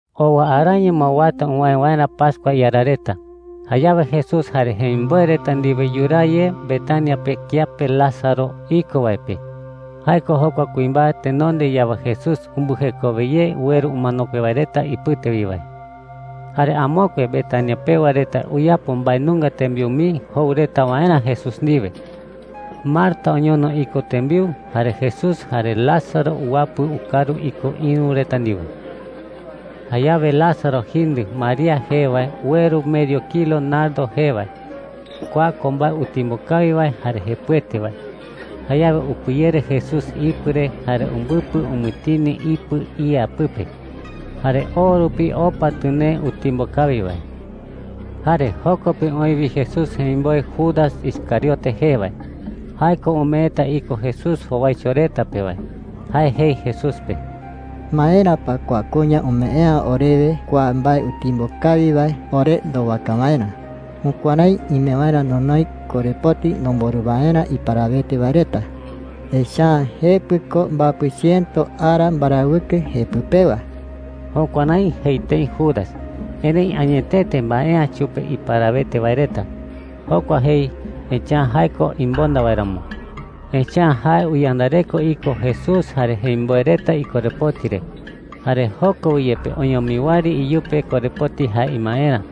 Owa araño ma uata uwäe waerä pascua iara reta. Jayawe Jesús jare jemimboe reta ndiwe yuraa ye Betania pe kiape Lázaro iko wae pe. Jae ko jokua kuimbae tenonde yawe Jesús umbɨjekowe ye ueru umanokue wae reta ipɨte wi wae. Jare amokue Betania pewa reta uyapo mbae nunga tembiu mii jou reta waerä Jesús ndiwe. Marta oñono iko tembiu, jare Jesús jare Lázaro uwapɨ ukaru iko ïru reta ndiwe. Jayawe Lázaro jindɨ María jee wae ueru medio kilo nardo jee wae. Kua ko mbae utimbo kawi wae jare jepɨete wae. Jayawe upɨyere Jesús ipɨ re jare umbɨpɨ umɨtini ipɨ ía pɨpe. Jare o rupi opa tɨnee utimbo kawi wae. Jare joko pe oï wi Jesús jemimboe Judas Iscariote jee wae – jae ko umeeta iko Jesús jowaicho reta pe wae. Jae jei Jesús pe: “¿Maera pa kua kuña umee’ä orewe kua mbae utimbo kawi wae ore ndowaka waerä? Jukuärái ime waerä nonoi korepoti nomborɨ waerä iparawete wae reta. Echa’ä jepɨ ko mbapɨ chiëto ara mbarawɨkɨ jepɨ pewa.” Jukuärái jei tëi Judas, erëi añetete mbae’ä chupe iparawete wae reta. Jokua jei, echa’ä jae ko imonda wae ramo. Echa’ä jae uyandareko iko Jesús jare jemimboe reta ikorepoti re, jare joko wi yepe oñomi wɨari iyupe korepoti jae imaerä.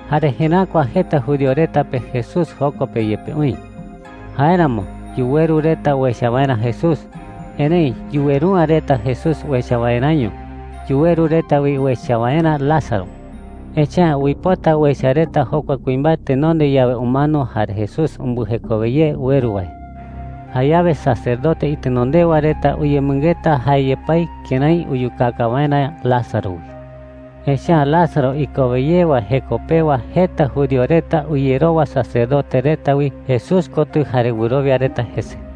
Jare jeräkua jeta judío reta pe Jesús joko pe yepe oï. Jáeramo yuweru reta uecha waerä Jesús. Erëi yuweru’ä reta Jesús uecha waeräño. Yuweru reta wi uecha waerä Lázaro. Echa’ä uipota uecha reta jokua kuimbae tenonde yawe umano jare Jesús umbɨjekowe ye ueru wae. Jayawe sacerdote itenondewa reta uyemɨngeta jae yepái kërái uyukaka waerä Lázaro wi. Echa’ä Lázaro ikowe ye wae jeko pewa jeta judío reta uyerowa sacerdote reta wi Jesús kotɨ jare wɨrowia reta jese.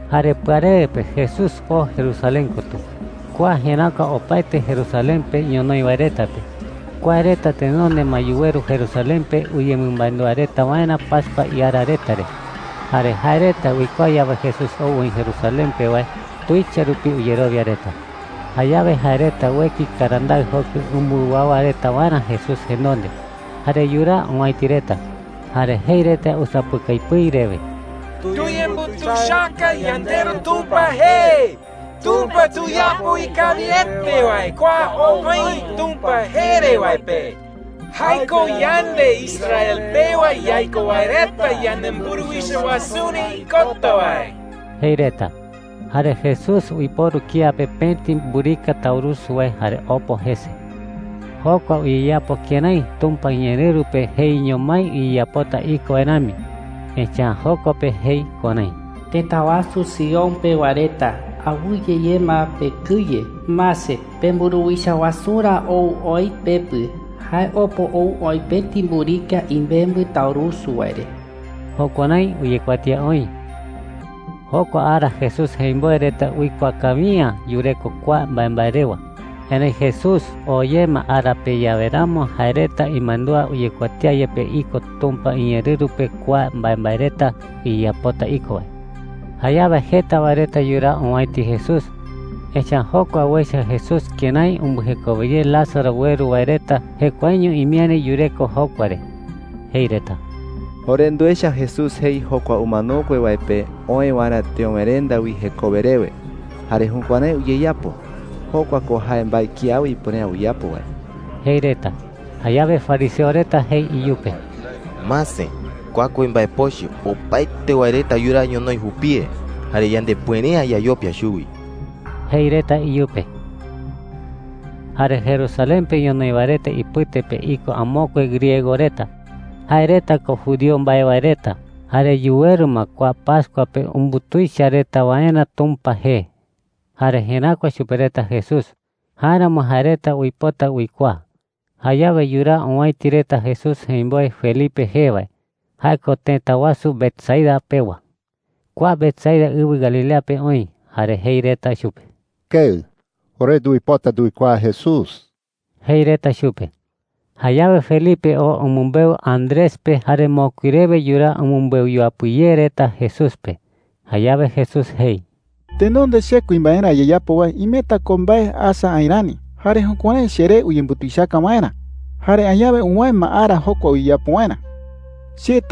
Jare pɨarewe pe Jesús oo Jerusalén kotɨ. Kua jeräkua opaete Jerusalén pe ñonoï wae reta pe. Kua reta tenonde ma yuweru Jerusalén pe uyemɨmandúa reta waerä pascua iara reta re. Jare jae reta uikuaa yawe Jesús ou oï Jerusalén pe wae, tuicha rupi uyerowia reta. Jayawe jae reta ueki karandaɨ jokɨ umbɨwawa reta waerä Jesús jenonde, jare yuraa owäiti reta. Jare jei reta usapɨkai pɨi rewe: “¡Tuyembutuichaka yandeRu Tumpa jee! ¡Tumpa tuyapo ikawiete wae kua ou oï Tumpa jee re wae pe! ¡Jae ko yande Israel pewa yaiko wae reta yanemburuwicha wasurä ikota wae!” jei reta. Jare Jesús uiporu kía pe pëti mburika taurusu wae jare opo jese. Jokua uyeyapo kërái Tumpa iñeerɨru pe jeiño mái uyeyapota iko wae rami. Echa’ä joko pe jei kuärái: “Tëta wasu Sion Sion ko jae tëta wasu Jerusalén. pewa reta, awɨye ye ma pekɨye. Mase, pemburuwicha wasurä ou oï pepɨ. Jae opo ou oï pëti mburika imembɨ taurusu wae re.” Jukuärái uyekuatía oï. Jokua ara Jesús jemimboe reta uikuaa kawi’ä yureko kua mbaembae rewa. Erëi Jesús oo ye ma ara pe yawe ramo jae reta imandúa uyekuatía yepe iko Tumpa iñeerɨru pe kua mbaembae reta uyeyapota iko wae. Jayawe jeta wae reta yuraa owäiti Jesús, echa’ä jokua uecha Jesús kërái umbɨjekowe ye Lázaro ueru wae reta jekuaeño imiäri yureko jokua re. Jei reta: “Ore nduecha Jesús jei jokua umanokue wae pe oë waerä teöwerenda wi jekowe rewe, jare jukuärái uyeyapo. Jokua ko jae mbae kiawe ipuere’ä uyapo wae,” jei reta. Jayawe fariseo reta jei iyupe: “Mase, kua kuimbae pochɨ, opaete wae reta yuraa ñonoï jupie. Jare yandepuere’ä yayopia chuwi,” jei reta iyupe. Jare Jerusalén pe ñonoï wae reta ipɨte pe iko amokue griego reta. Jae reta ko judío mbae wae reta jare yuweru ma kua pascua pe umbutuicha reta waerä Tumpa jee. Jare jeräkua chupe reta Jesús; jáeramo jae reta uipota uikuaa. Jayawe yuraa owäiti reta Jesús jemimboe Felipe jee wae – jae ko tëta wasu Betsaida pewa. Kua Betsaida ɨwɨ Galilea pe oï. Jare jei reta chupe: “Keɨ, ore nduipota nduikuaa Jesús,” jei reta chupe. Jayawe Felipe oo umɨmbeu Andrés pe, jare mokui rewe yuraa umɨmbeu yuapɨ ye reta Jesús pe. Jayawe Jesús jei: “Tenonde che kuimbaerä ayeyapo wae imeta ko mbae asa aï rani, jare jukuärái cheree uyembutuichaka waerä. Jare añawe uwäe ma ara jokua uyeyapo waerä,” jei.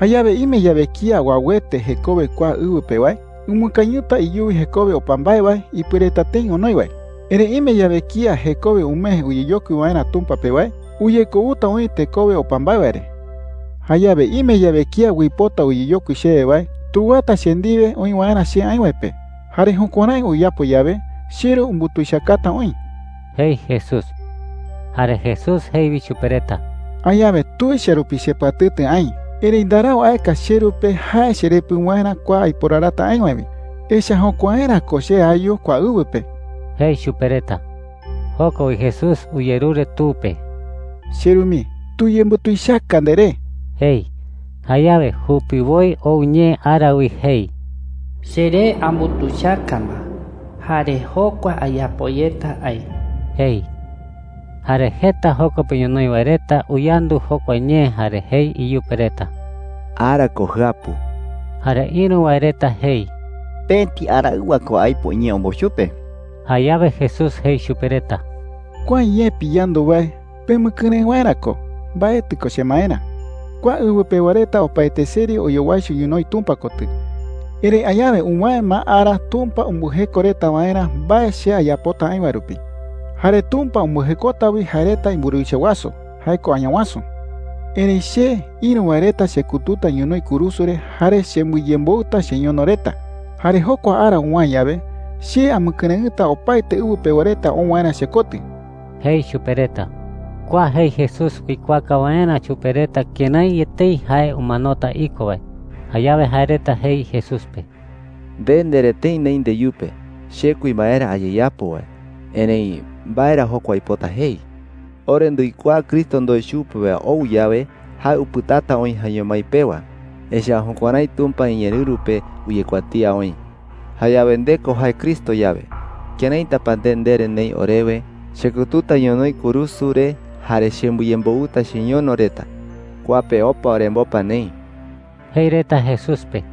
“Jayawe ime yawe kía uauete jekowe kua ɨwɨ pe wae, umɨkañɨta iyuwi jekowe opa mbae wae ipuereta tëi onoi wae. Erëi ime yawe kía jekowe umee uyeyokui waerä Tumpa pe wae, uyekouta oï tekowe opa mbae wae re,” jei. “Jayawe ime yawe kía uipota uyeyokui chewe wae, tuwata che ndiwe oï waerä che aï wae pe. Jare jukuärái uyapo yawe, cheRu umbutuichakata oï,” jei Jesús. Jare Jesús jei wi chupe reta: “Añawe tuicha rupi chepɨatɨtɨ aï. Erëi ndarau aeka cheRu pe jae cherepɨ waerä kua aiporarata aï wae wi. Echa’ä jokuaerä ko che ayu kua ɨwɨ pe,” jei chupe reta. Joko wi Jesús uyerure Tu pe: “CheRu mii, tuyembutuichaka nderee,” jei. Jayawe jupiwoi ou ñee ara wi jei: “Cheree ambutuichaka ma. Jare jokua ayapo yeta aï,” jei. Jare jeta joko pe ñonoï wae reta uyandu jokua ñee jare jei iyupe reta: “Ara ko jɨapu.” Jare ïru wae reta jei: “Pëti araɨwa ko aipo iñee ombou chupe.” Jayawe Jesús jei chupe reta: “Kua ñee piyandu wae, pemɨkɨrëɨ waerä ko. Mbaetɨ ko chemaerä,” jei chupe reta. “Kua ɨwɨ pewa reta opaete seri oyowaicho ñonoï Tumpa kotɨ. Erëi añawe uwäe ma ara Tumpa umbɨjeko reta waerä mbae che ayapota aï wae rupi. Jare Tumpa umbɨjekota wi jae reta imburuwicha wasu – jae ko Añawasu,” jei. “Erëi che, ïru wae reta chekututa ñonoï kurusu re jare chembɨyemboɨta cheñono reta. Jare jokua ara uwäe yawe, che amɨkɨrëɨta opaete ɨwɨ pewa reta ou waerä chekotɨ,” jei chupe reta. Kua jei Jesús uikuaaka waerä chupe reta kërái etei jae umanota iko wae. Jayawe jae reta jei Jesús pe: “Nde ndere tëi neï ndeyupe ‘che kuimbaerä ayeyapo wae.’ Erëi ¿mbae ra jokua uipota jei? Ore nduikuaa Cristo ndoe chupe wae ou yawe, jae upɨtata oï jaeño mái pewa, echa’ä jukuärái Tumpa iñeerɨru pe uyekuatía oï. Jayawe nde ko jae Cristo yawe, ¿këraita pa nde ndere neï orewe, ‘chekututa ñonoï kurusu re jare chembɨyemboɨta cheñono reta’? Kua pe opa orembopa neï,” jei reta Jesús pe.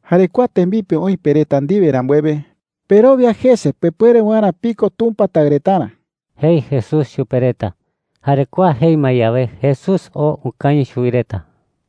“Jare kua tembipe oï pe reta ndiwe rambuewe, perowia jese pepuere waerä piko Tumpa taɨ retarä,” jei Jesús chupe reta. Jare kua jei ma yawe, Jesús oo ukañɨ chuwi reta.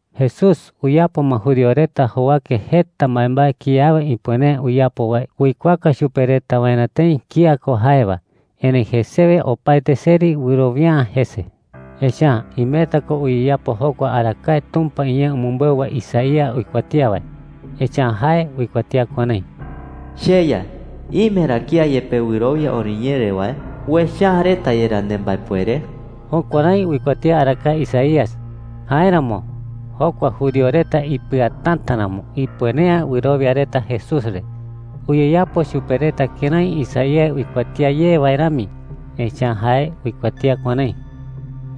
Jesús uyapo ma judío reta jowake jeta mbaembae kiawe ipuere’ä uyapo wae uikuaaka chupe reta waerä tëi kía ko jae wae. Erëi jesewe opaete seri wɨrowia’ä jese. Echa’ä imeta ko uyeyapo jokua arakae Tumpa iñee umɨmbeu wae Isaías uikuatía wae. Echa’ä jae uikuatía kuärái: “CheYa, ¿ime ra kía yepe wɨrowia oriñee re wae? ¿Uecha’ä yerá reta nembaepuere?” Jukuärái uikuatía arakae Isaías. Jáeramo jokua judío reta ipɨatäta ramo, ipuere’ä wɨrowia reta Jesús re. Uyeyapo chupe reta kërái Isaías uikuatía ye wae rami. Echa’ä jae uikuatía kuärái: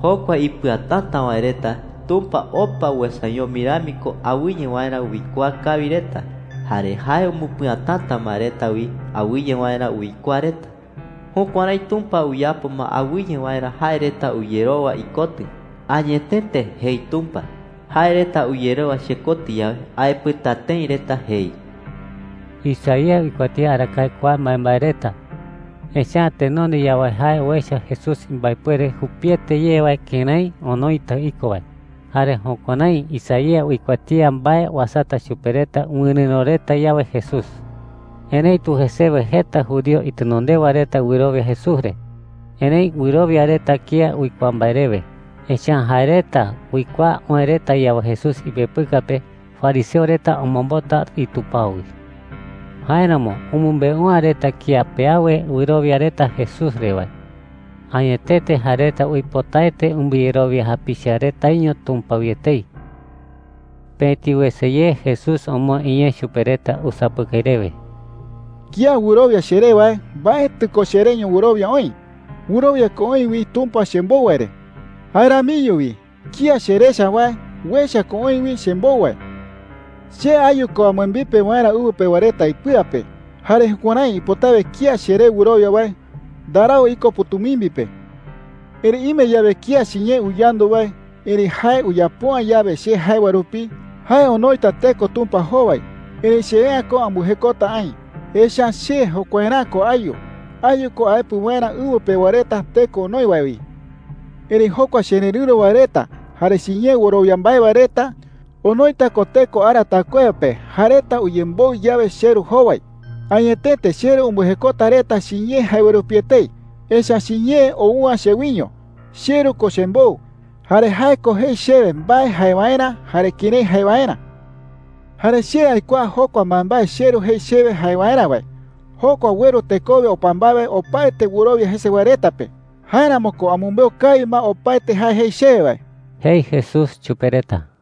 “Jokua ipɨatäta wae reta, Tumpa opa uesañoma rami ko awɨye waerä uikuaa kawi reta. Jare jae umbɨpɨatäta ma reta wi awɨye waerä uikuaa reta. Jukuärái Tumpa uyapo ma awɨye waerä jae reta uyerowa ikotɨ. ‘Añetete,’ jei Tumpa, ‘jae reta uyerowa chekotɨ yawe, aepɨta tëi reta,’ jei.” Isaías uikuatía arakae kua mbaembae reta, echa’ä tenonde yawe jae uecha Jesús imbaepuere jupiete ye wae kërái onoita iko wae. Jare jukuärái Isaías uikuatía mbae uasata chupe reta wɨrɨ̈ro reta yawe Jesús. Erëitu jesewe jeta judío itenondewa reta wɨrowia Jesús re. Erëi wɨrowia reta kía uikuaa mbae rewe. Echa’ä jae reta uikuaa oë reta yawe Jesús ipepɨka pe, fariseo reta omombota itupao wi. Jáeramo umɨmbeu’ä reta kía pe awe wɨrowia reta Jesús re wae. Añetete jae reta uipotaete umbɨyerowia japicha retaño Tumpa wi etei. Pëti wese ye Jesús omoë iñee chupe reta usapɨkai rewe: “Kía wɨrowia cheré wae, mbaetɨ ko chereño wɨrowia oï. Wɨrowia ko oï wi Tumpa chembou wae re. Jae ramiño wi kía cherecha wae, uecha ko oï wi chembou wae,” jei. “Che ayu ko ambɨembipe waerä ɨwɨ pewa reta ipɨa pe. Jare jukuärái ipotawe kía cheré wɨrowia wae ndarau iko pɨ̈tumimbi pe,” jei. “Erëi ime yawe kía chiñee uyandu wae, erëi jae uyapo’ä yawe che jae wae rupi, jae onoita teko Tumpa jowai. Erëi che’ä ko ambɨjekota aï, echa’ä che jokuaerä'ä ko ayu. Ayu ko aepɨ waerä ɨwɨ pewa reta teko onoi wae wi,” jei. “Erëi jokua chererɨ̈ro wae reta jare chiñee wɨrowia mbae wae reta onoita ko teko ara taɨkuewa pe jae reta uyemboɨ yawe cheRu jowai. Añetete, cheRu umbɨjekota reta chiñee jae wae rupi etei, echa’ä chiñee ou’ä chewiño. CheRu ko chembou, jare jae ko jei chewe mbae jae waerä jare kërái jae waerä,” jei. “Jare che aikuaa jokua mbaembae cheRu jei chewe jae waerä wae, jokua ueru tekowe opa mbae wae opaete wɨrowia jese wae reta pe. Jáeramo ko amɨmbeu kawi ma opaete jae jei chewe wae,” jei Jesús chupe reta.